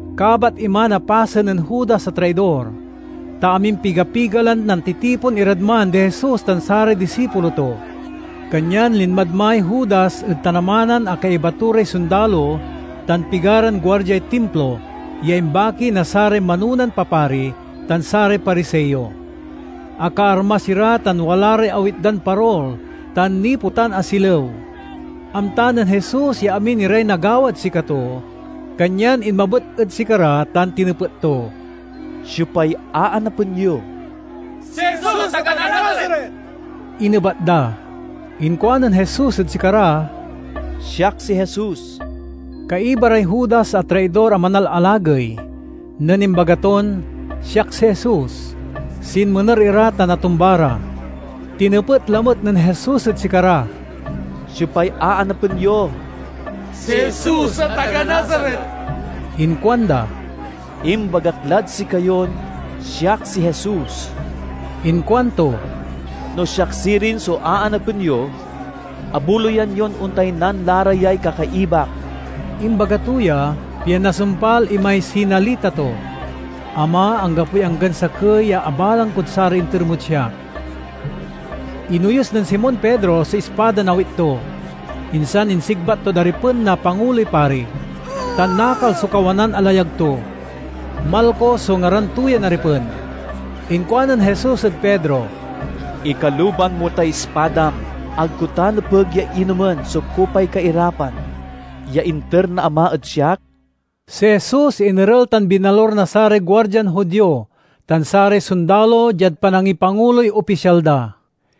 Kabat iman a pasen nen Judas a traidor, ta amimpiga-piga lan nantitipon irad man di Jesus tan saray disipulo to. Kanyan linmad may Judas ed tanamanan a kaiba to ray sondalo tan pigaran guardiay Timplo ya imbaki na saray manonan papari tan saray Pariseo. Akaarmas ira tan wala ray awit dan parol tan nipetan a silew. Amta nen Jesus ya amin iray nagawad sikato, kanyan inmabet ed sikara tan tinepet to, "Siopay aanapen yo?" "Si Jesus a taga Nazaret," inebat da. Inkuanen Jesus ed sikara, "Siak si Jesus." Kaiba ray Judas a traidor a manalalagey. Nen imbaga ton, "Siak si Jesus," sinmener ira tan atumba ra. Tinepet lamet nen Jesus ed sikara, "Siopay aanapen yo?" "Si Jesus a taga Nazaret," inkuanda. "Imbagak lad sikayon siak si Jesus," inkuanto. "No siak sirin so aanapen yo, abuloyan yon ontaynan la ra yay kakaibak." (Imbaga to ya, pian nasumpal imay sinalita to, "Ama, anggapoy anggan sakey ya abalang kod saray inter mod siak.") Inoyus nen Simon Pedro so ispadan awit to, insan insigbat tod aripen na Panguloy Pari, tan nakal so kawanan a layag to. Malco so ngaran to yan aripen. Inkuanen Jesus ed Pedro, "Ikaluban mo tay ispadam. Ag ko ta nepeg ya inomen so kupay kairapan ya inter na Ama ed siak?" Si Jesus inerel tan binalur na saray guardian Judio tan saray sondalo diad panangipanguloy opisyal da.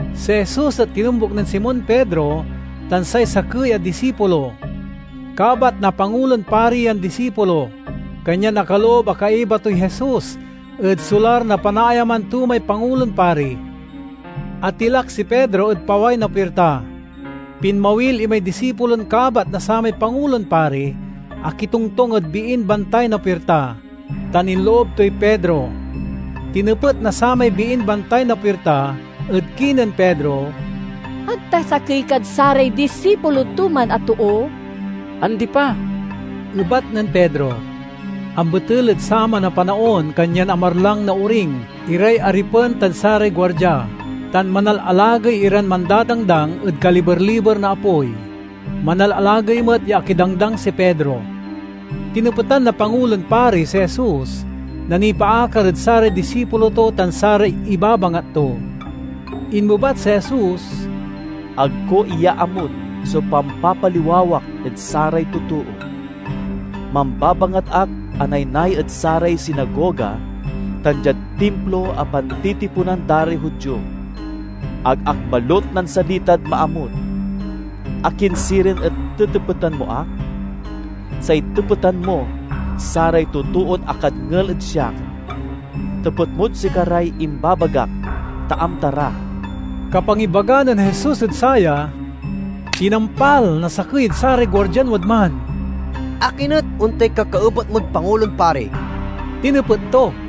Si Jesus et tinombuk nen Simon Pedro tan say sakey a disipulo. Kabat na Pangulon Pari yan disipulo, kanyan akaloob a kaiba toy Jesus ed solar na panaayaman to may Pangulon Pari. Atilak si Pedro ed paway na puirta. Pinmawil imay disipulon kabat na samay Pangulon Pari, akitongtong ed biin bantay na puirta, tan inloob toy Pedro. Tinepet na samay biin bantay na puirta ed kinen Pedro, "Ag ta sakey kad saray disipulo to man a too?" "Andi pa," ebat nen Pedro. Ambetel ed saman a panaon kanyan amarlang na oring iray aripen tan saray guardia, tan manalalagey iran mandadangdang ed kaliber-liber na apoy. Manalalagey met ya akidangdang si Pedro. Tinepetan na Pangulon Pari si Jesus, na nipaakar ed saray disipulo to tan saray ibabangat to. Inmebat si Jesus, "Ag ko iyaamut so pampapaliwawak ed saray totoo. Mambabangat ak a naynay ed saray sinagoga tan diad Timplo a pantitiponan da ray Judio. Ag ak balut nansalitad maamut. Akin sirin et tetepetan mo ak? Say tepetan mo saray totoon akadngel ed siak. Tepet mod sikaray imbabagak ta amta ra." Kapangibaga nen Jesus ed saya, tinampal na sakey ed saray guardian wadman. "Akin et ontay kakaebat mod Pangulon Pari?" tinepet to.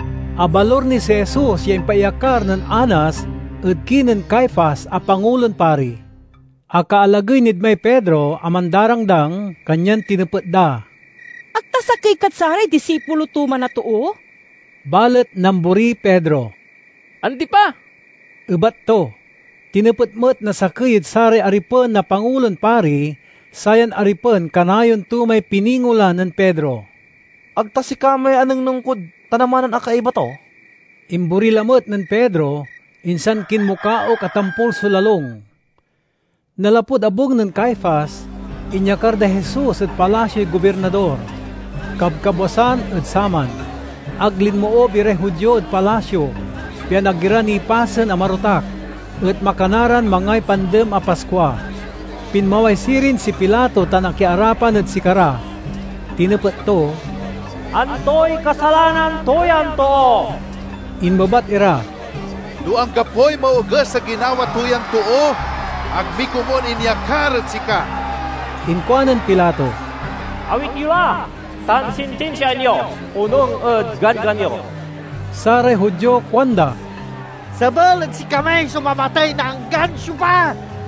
Abalur ni si Jesus ya impaiyakar nen Anas ed kinen Caifas a Pangulon Pari. Akaalagey nid may Pedro a mandarangdang, kanyan tinepet da, "Ag ta sakey kad saray disipulo to man a too?" Balet namboriy Pedro. "Andi pa," ebat to. Tinepet met na sakey ed saray aripen na Pangulon Pari (sayan aripen kanayon to may piningolan nen Pedro), "Ag ta sika may anengneng kod tanamanan a kaiba to?" Imbori lamet nen Pedro, insan kinmukaok a tampol so lalung. Nanlapud abung nen Caifas, inyakar day Jesus ed palasioy gobirnador. Kabkabwasan ed saman. Ag linmoob iray Judio ed palasio, pian ag ira nipasen a marotak, et makana ran mangay pandem a Paskua. Pinmaway sirin si Pilato tan akiarapan ed sikara. Tinepet to, "Antoy kasalanan to yan too?" Inmebat ira, "No anggapoy maoges a ginawa to yan too, ag mi komun inyakar ed sika." Inkuanen Pilato, "Awit yo la tan sintinsiaan yo, onung ed ganggan yo." Saray Judio kuanda, "Sebel ed sikami so mamatey na anggan siopa."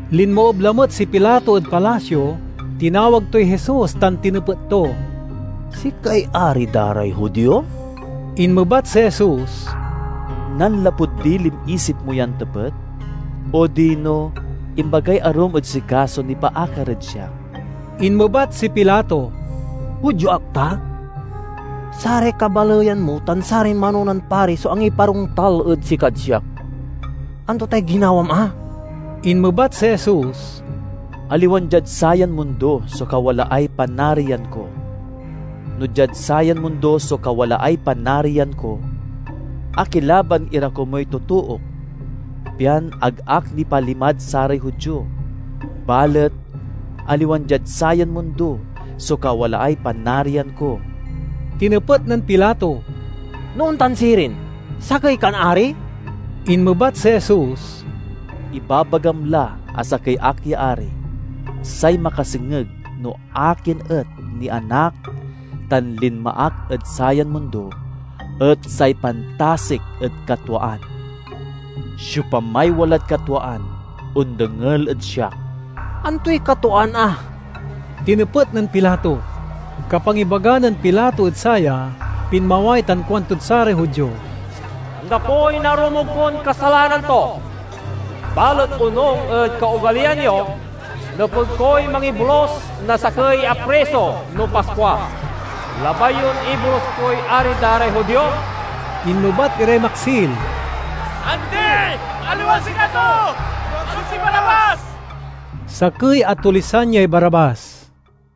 Linmoob lamet si Pilato ed palasio, tinawag toy Jesus tan tinepet to, "Sikay ari da ray Judio?" Inmebat si Jesus, "Nanlapud dilin isip mo yan tepet, odino imbagay arum ed sika so nipaakar ed siak?" Inmebat si Pilato, "Judio ak ta? Saray kabaleyan mo tan saray manonan pari so angiparontal ed sikad siak. Anto tay ginawam a?" Inmebat si Jesus, "Aliwan diad sayan mundo so kawalaay panarian ko. No diad sayan mundo so kawalaay panarian ko, akilaban ira komuy totook, pian ag ak nipalimad saray Judio. Balet, aliwan diad sayan mundo so kawalaay panarian ko!" Tinepet nen Pilato, "No ontan sirin, sakey kan ari?" Inmebat si Jesus, "Ibabagam la a sakey ak ya ari. Say makasengeg no akin et nianak tan linma ak ed sayan mundo et say pantasik ed katwaan. Siopamay walad katwaan ondengel ed siak." "Antoy katwaan a?" tinepet nen Pilato. Kapangibaga nen Pilato ed saya, pinmaway tan kuantod saray Judio, "Anggapoy narumog kon kasalanan to. Balet onung ed kaogaliyan yo, nepeg koy mangibolus na sakey a priso no Paskua. Labay yon ibolus koy ari da ray Judio?" Inmebat iray maksil, "Andi! Aliwan sikato, no ag si Barabbas!" (Sakey a tulisan yay Barabbas.)